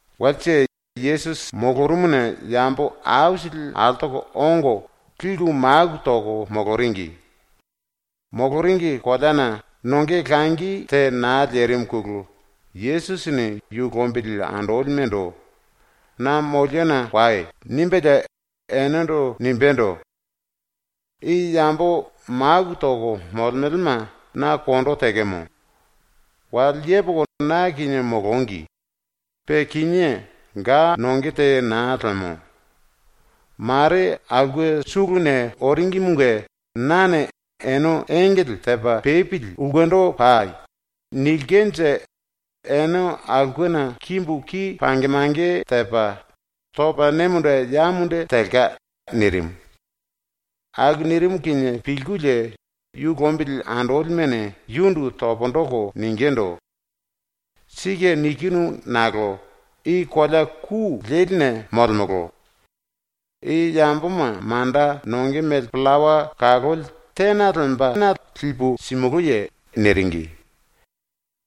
Walse Yesusi molorumuna yambo aisili altoko ongo liku maku toko moloringi. Moloringi koleana nonge langi te naa lerimuna Yesusini yu lombili andolimendo “Na moliona wai.” nimbelie enendo nimbendo: “I yambo maku toko molemelema na kondo tekemo. Wale yepoko na kinie molongi, pe kinié ga nonge te naa lemo. Mare aulke suluna oringimunge nane “Ene engele tepa pepili ulkendo pai.” nilkenje ene aulkena kimbu ki pange mange tepa, topa ne munde ya munde telka.” nirimu. Aku nirimu kinie pilkulie yu lombili andolimene yundu pundu toko ningindu: “⸤Sike nikinu nakolo⸥ i kolea ku leline molemolo. I yamboma manda nonge mele pillawa kaloli tena lembana lipu simulúye?” niringi.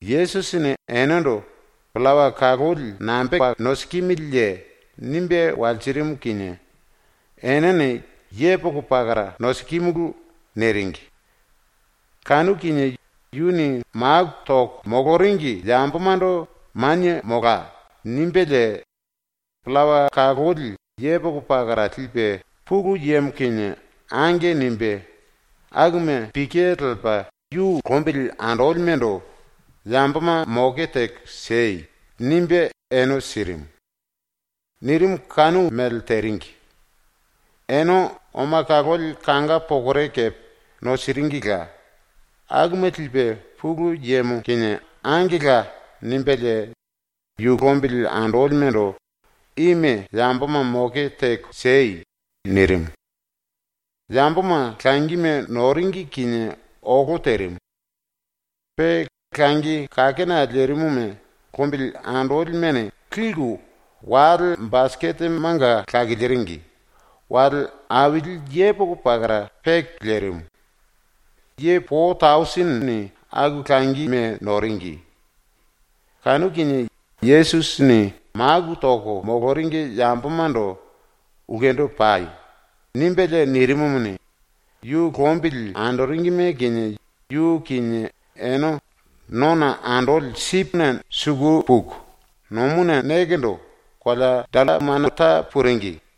Yesusini enendo “Pillawa kaloli nambepa nosikimiliye?” nimbe walsirimu kinie enene “Yepoko pakara nosikimulu.” niringi. Kanu kinie yuni maku toko moloringi yambomando “Manie molai.” nimbelie, pillawa kaloli yepoko pakara lipe ⸤Pulu Yemo kinie⸥ “Ange.” nimbe, akuma pike lepa yu lombili andolimendo “Yamboma moke teko siei.” nimbe ene sirimu. Nirimu kanu mele teringi. Ene oma kaloli kanga pokore kepe nosiringila, akuma lipe ⸤Pulu Yemo kinie⸥ “Angela.” nimbelie yu lombili andolimendo “Ime yamboma moke teko siei.” nirimu. Yamboma ⸤langime⸥ noringi kinie olo terimu. Pe langi kakena lerimuma lombili andolimene liku wale basiketemanga lakiliringi, wale aili yepoko pakara peke lerimu. Ye po tausinini aku langime noringi. Kanu kinie Yesusini maku toko moloringi yambomando “Ulkendo pai.” nimbelie nirimumuni, yu lombili andolime kinie yu kinie ene nona andoli sipine suku puku, ⸤nomuna nekendo⸥ kolea Dallamanuta puringi.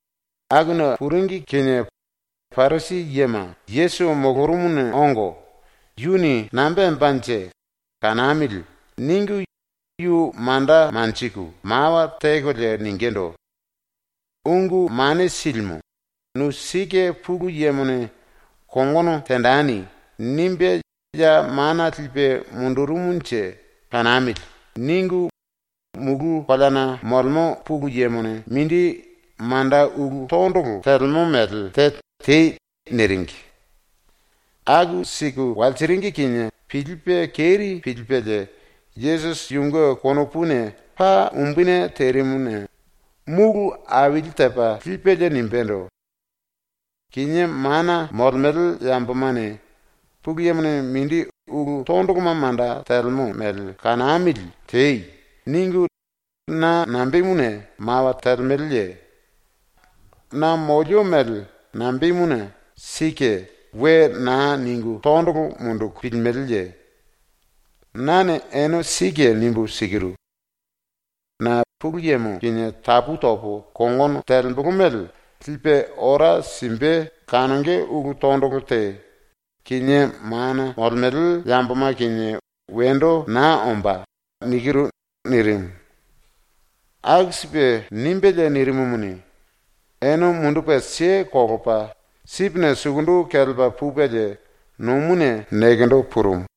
Akuna puringi kinie Parisi yema Yesusi molorumuna ongo, ‘Yuni nambe tembanje? Kanamili.’ ningu yu manda manjiku mawa tekolie ningindu: “⸤Ungu Mane Silimu,⸥ ‘Nu sike Pulu Yemone ‘Kongono tenjeni.’ nimbe ya mana lipe mundurumunje kanamili.’ ningu mulu koleana molemo ⸤Pulu⸥ Yemone mindi manda ulu ⸤tondolo⸥ telemo mele te tei.” niringi. ⸤Aku siku walsiringi kinie pilipe keri pilipelie Yesusi⸥ yunge konopuna paa umbuni terimuna múlu aili tepa lipelie nimbendo: “Kinié mana molemele yambomane “Pulu Yemone mindi ulu tondoloma manda telemo mele kanamili tei.” ningu na nambemuna mawa telemeleye? ⸤Na molio mele nambemuna “Sike.” we naa ningu tondolo munduku pilimeleye?⸥ Nane ene sike nimbu sikiru: ⸤Na Pulu Yemo kinie tapu topo kongono telembolo mele⸥ lipe ora simbe kanonge ulu tondolo te, kinié mana molemele yamboma kinie wendo naa ombá.” nirimu. Aku sipe nimbelie nirimumuni, ene mundupe kelepa sipine suku kelepa pupelie nomuna nekendo purumu.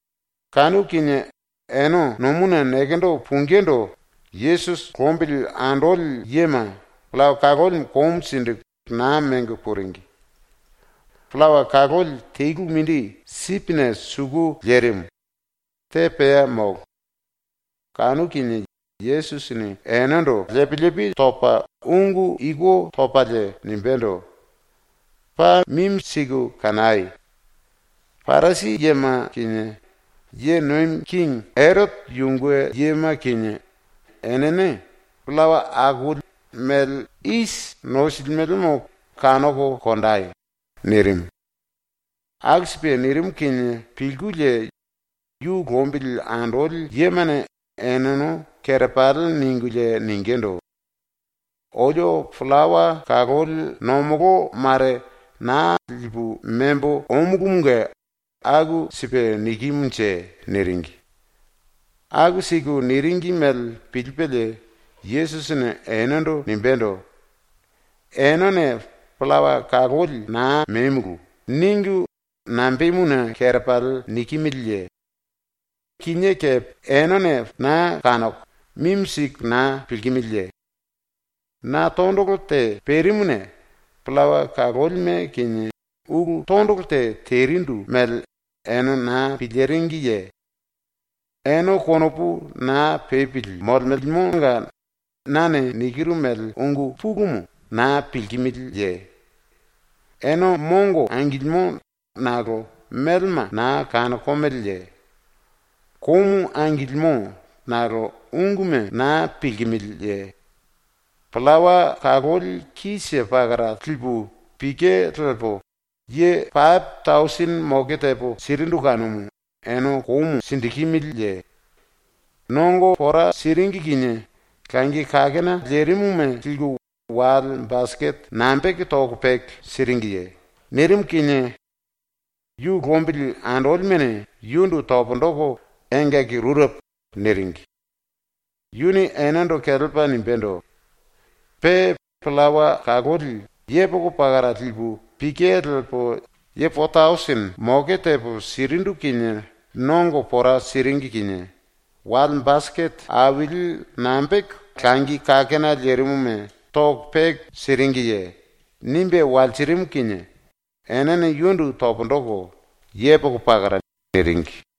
⸤Kanu kinie ene nomuna nekendo pungindu Yesusi lombili andoli yema⸥ pillawa kaloli komu siku naa mengo puringi. Pillawa kaloli telu mindi sipine suku lerimu, te pea molo. Kanu kinie Yesusini enendo lepi lepi topa ⸤ungu iku topalie⸥ nimbendo: “Paa mimi siku kanai! Parisi yema kinie ⸤ye nomi kingi⸥ Erote yunge yema kinie enene pillawa akoli mele isi nosilimelemo kanoko konjei!” nirimu. Aku sipe nirimu kinie pilkulie yu lombili andoli yemane eneno kerepali ningulie ningindu: “Olio pillawa kaloli ⸤nomolo⸥ mare naa lipu membo omulumunge aku sipe nikimunje.” niringi. Aku siku niringi mele pilipelie Yesusini enendo nimbendo: “Enene “Pillawa kaloli naa memulu.” ningu nambemuna kerepali nikimiliye? Ene kinié kepe naa kanoko, mimi siku naa pilkimiliye? Na tondolo te perimuna pillawa kalolime kinie ulu tondolo te terindu mele ene naa piliringiye? Ene konopu naa pepili molemelemonga nane nikiru mele ungu pulumu naa pilkimiliye? Ene mongo angilimo nakolo melema naa kanokomeleye? Komu angilimo nakolo unguma naa pilkimiliye? Pillawa kaloli te pakara lipu pike lepo ye pape tausini moke tepo sirindu kanumu ene komu sikimiliye? ⸤Nongo pora siringi kinie⸥ langi kakena lerimuma liku wale basikete nambepa toko peke siringiye?” nirimu kinie ⸤yu lombili andolimene⸥ yundu pundu toko “Engaki rurepo.” niringi. ⸤Yuni enendo kelepa nimbendo:⸥ “Pe pillawa kaloli yepoko pakara lipu pike lepo ⸤yambo⸥ po tausini moke tepo sirindu kinie ⸤nongo pora siringi kinie⸥ wale basikete aili nambepa langi kakena lerimuma toko peke siringiye?” nimbe walsirimu kinie enene yundu pundu toko “Yepoko pakara.” niringi.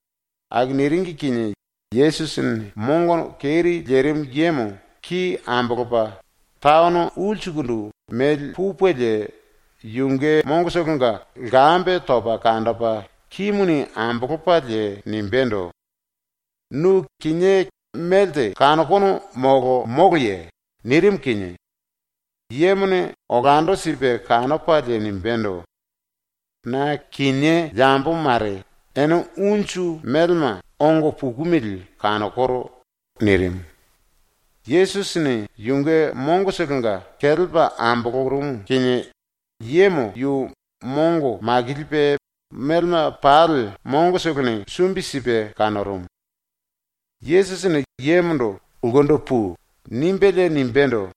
Aku niringi kinie Yesusini mongo keri lerimu yemo ki ambolopa taono ulsukundu memba pupelie yunge mongotolonga lkambe topa kanjipe kimuni ambolopalie nimbendo: “Nu kinié melte kanokono molo moloye?” nirimu kinie yemone olando sipe kanopalie nimbendo: “Na kinié yambo mare, ene unju melema ongo pukumili kanokoro.” nirimu. Yesusini yunge mongotolonga kelepa ambolorumu kinie yemo yu mongo makilipe melema pali mongotolone sumbi sipe kanorumu. Yesusini yemondo “Ulkendo pui.” nimbelie nimbendo: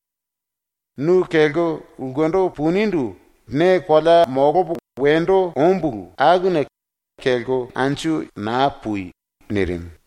“Nu kelko ulkendo punindu ne kolea ⸤molopo wendo ombulu⸥ akuna ⸤kelko yando⸥ naa pui.” nirimu.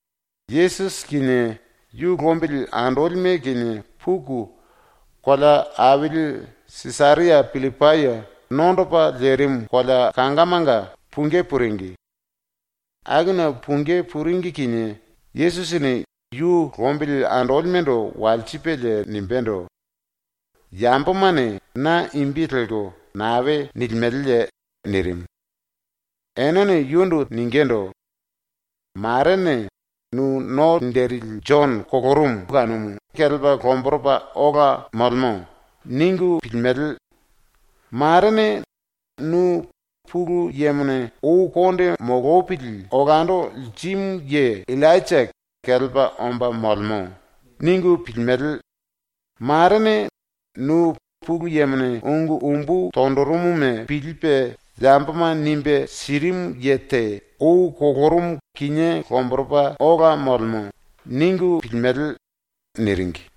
Yesusi kinie yu lombili andolime kinie puku kolea aili Sisaria Pillipai nondopa lerimu kolea kangamanga pungí puringi. Akuna pungí puringi kinie Yesusini yu lombili andolimendo walsipelie nimbendo: “Yambomane na imbi lelko nae nilimeleye?” nirimu. Enene yundu ningindu: “Marene “Nu No Linjili Jono ⸤kolorumu kinié kelepa lomboropa ola molemo⸥.” ningu pilku, marene “Nu ⸤Pulu Yemone ou konde molopili olando lirimu ye⸥ Illainja kelepa omba molemo.” ningu pilku, marene “Nu Pulu Yemone ungu umbu tonjirimuma pilipe yamboma nimbe sirimu ye te ⸤ou kolorumu kinié lomboropa ola molemo.⸥” ningu pilimele.” niringi.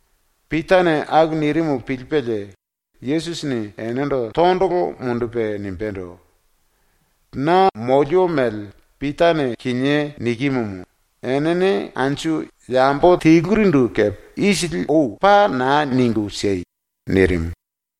⸤Pitane aku nirimu pilipelie⸥ Yesusini enendo tondolo mundupe nimbendo: “Na molio mele ⸤Pitane kinié nikimumu⸥ enene anju yambo telurindu kepe ⸤isili ou⸥ paa naa ningu siei!” nirimu.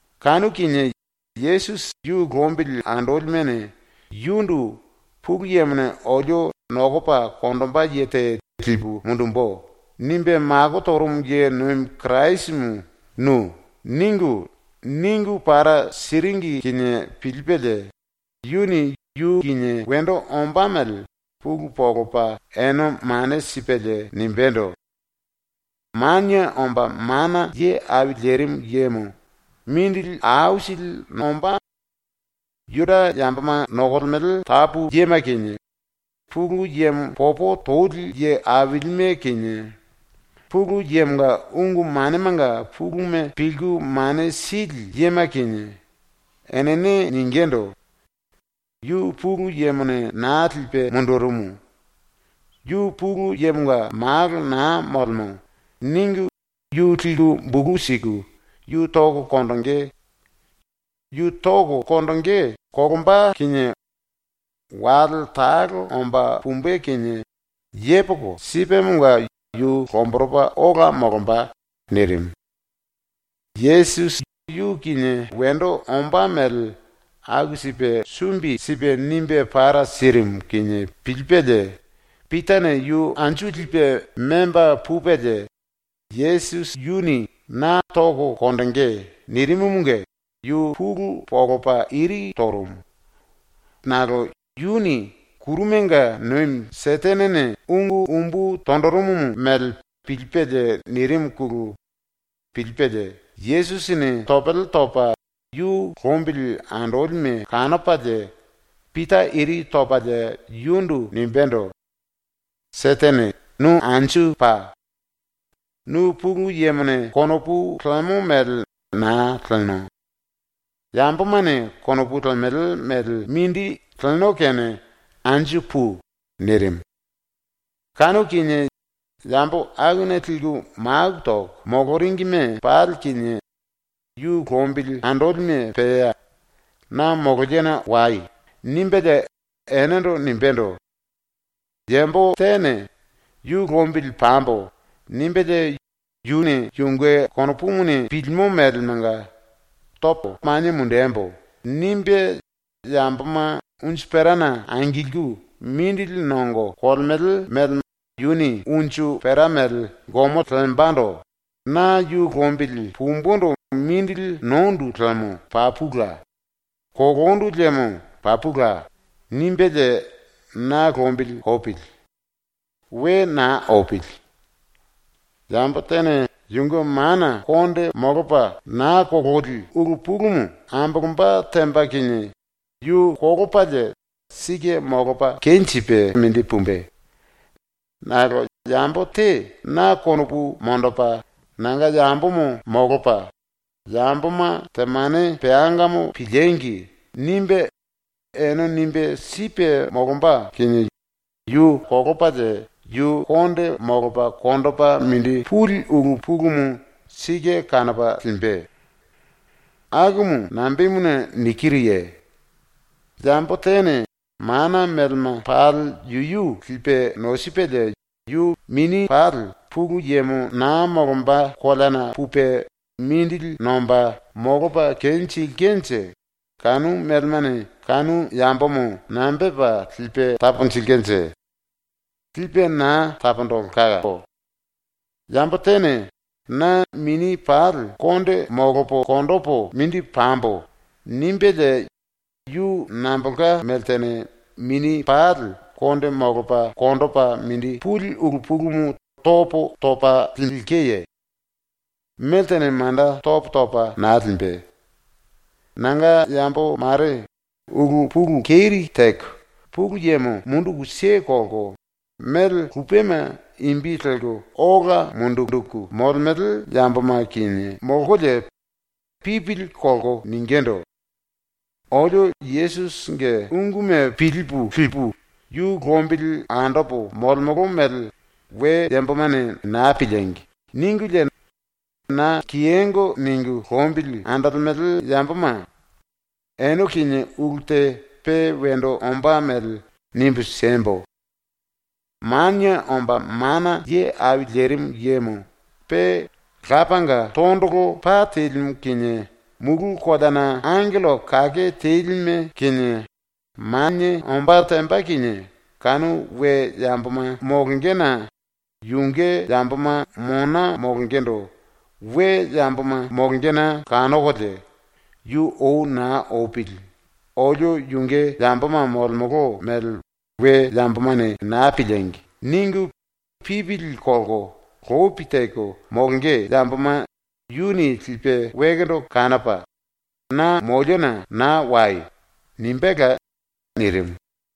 Kanu kinie Yesusi yu lombili andolimene yundu ⸤“Pulu Yemone olio “Nokopa konjimbe ye te lipu mundumbu.” nimbe mako torumu ye nomi Kirasimu nu.” ningu, ningu para siringi kinie pilipelie⸥ yuni yu kinie wendo ombá mele pulu monjipe ene mane sipelie nimbendo: “Manie Omba Mana Ye Au Lerimu Yemo mindili aisili nombá. Juda yamboma nokolemele tapu yema kinie, Pulu Yemo popo tonjili ye ailime kinie, Pulu Yemonga ungu manemanga puluma pilku mane sili yema kinie, enene ⸤ningindu: “Yu Pulu Yemone naa lipe mundurumu. Yu Pulu Yemonga Malo naa molemo.” ningu⸥ yu liku bulu siku yu toko konjingí. Yu toko konjingí kolomba kinie wale talo omba pumbe kinie yepoko sipemonga yu lomboropa ola molomba.” nirimu. Yesusi yu kinie wendo ombá mele aku sipe sumbi sipe nimbe para sirimu kinie pilipelie Pitane yu anju lipe memba pupelie ⸤Yesusi yuni “Na toko konjingí.” nirimumunge⸥ yu pulu monjipe iri torumu. Nakolo ⸤yuni kurumanga nomi Setenene ungu umbu tonjirimu mele pilipelie nirimuna pilipelie⸥ Yesusini topele topa yu lombili andolime kanopalie Pita iri topalie yundu nimbendo: “Setene, nu anju pa! Nu Pulu Yemone konopu lemo mele naa leno. Yambomane konopu lemele mele mindi leno kene anju pui!” nirimu. Kanu kinie yambo akuna liku maku toko moloringime pali kinie yu lombili andolime pea “Na moliona wai.” nimbelie enendo nimbendo: “Yambo tene ‘Yu lombili pambo.’ nimbelie yuni yunge konopumuni pilimo melemanga ‘Topo manie mundembo.’ nimbe yamboma unju perana angilku mindili nongo kolemele mele yuni unju pera mele gomo lembando ‘Na yu lombili pumbundu mindili nondu liemo papula; kolondu liemo papula.’ nimbelie na lombili opili. We naa opili. Yambo tene yunge mana molopa naa kololi ulu pulumu ambolomba temba kinie yu kolopalie sike molopa kenjipe mindi pumbe. Nakolo yambo te na konopu monjipe nanga yambomo molopa, ‘Yamboma temane peangamo piliengi!’ nimbe ene nimbe sipe molomba kinie yu kolopalie yu konde molopa konjipe mindi puli ulu pulumu sike kanopa limbe. ⸤Akumu nambemuna nikiruye?⸥ Yambo tene mana melema pali yuyu lipe nosipelie yu mini pali Pulu Yemo naa molomba koleana pupe mindili nomba molopa kenjilkenje kanu melemane kanu yambomo nambe tepa lipe taponjilkenje? Lipe naa taponjilkemo. Yambo tene ‘Na mini pali konde molopo konjipu mindi pambo.’ nimbelie yu nambolka meltene mini pali konde molopa konjipe mindi puli ulu pulumu topo topa lilkeye? Meltene manda topo topa naa limbe. “Nanga yambo mare ulu pulu keri teko Pulu Yemo munduku kelko mele lupema imbi ambolko ola linjiku molemele yamboma kinie molkolie pipili kolko ningindu: “Olio Yesusinge unguma pilipu lipu, yu lombili andopo molemolo mele we yambomane naa piliengi!” ningulie na kiyongo ningu lombili andolemele yamboma, ene kinie ulu te pe wendo ombá mele nimbu siembo: Manie Omba Mana Ye Au Lerimu Yemo pe Lapanga tondolo pa telimu kinie ⸤mulu koleana⸥ angello kake telime kinie ⸤manie⸥ ombá temba kinie, kanu we yamboma molongena yunge yamboma mona molongendo we yamboma molongena kanokolie, yu ou naa opili ‘Olio yunge yamboma molemolo mele we yambomane naa piliengi!’ ningu pipili kolko lopi teko molonge yamboma yuni lipe wekendo kanopa, “Na moliona naa wai!” nimbéla.” nirimu.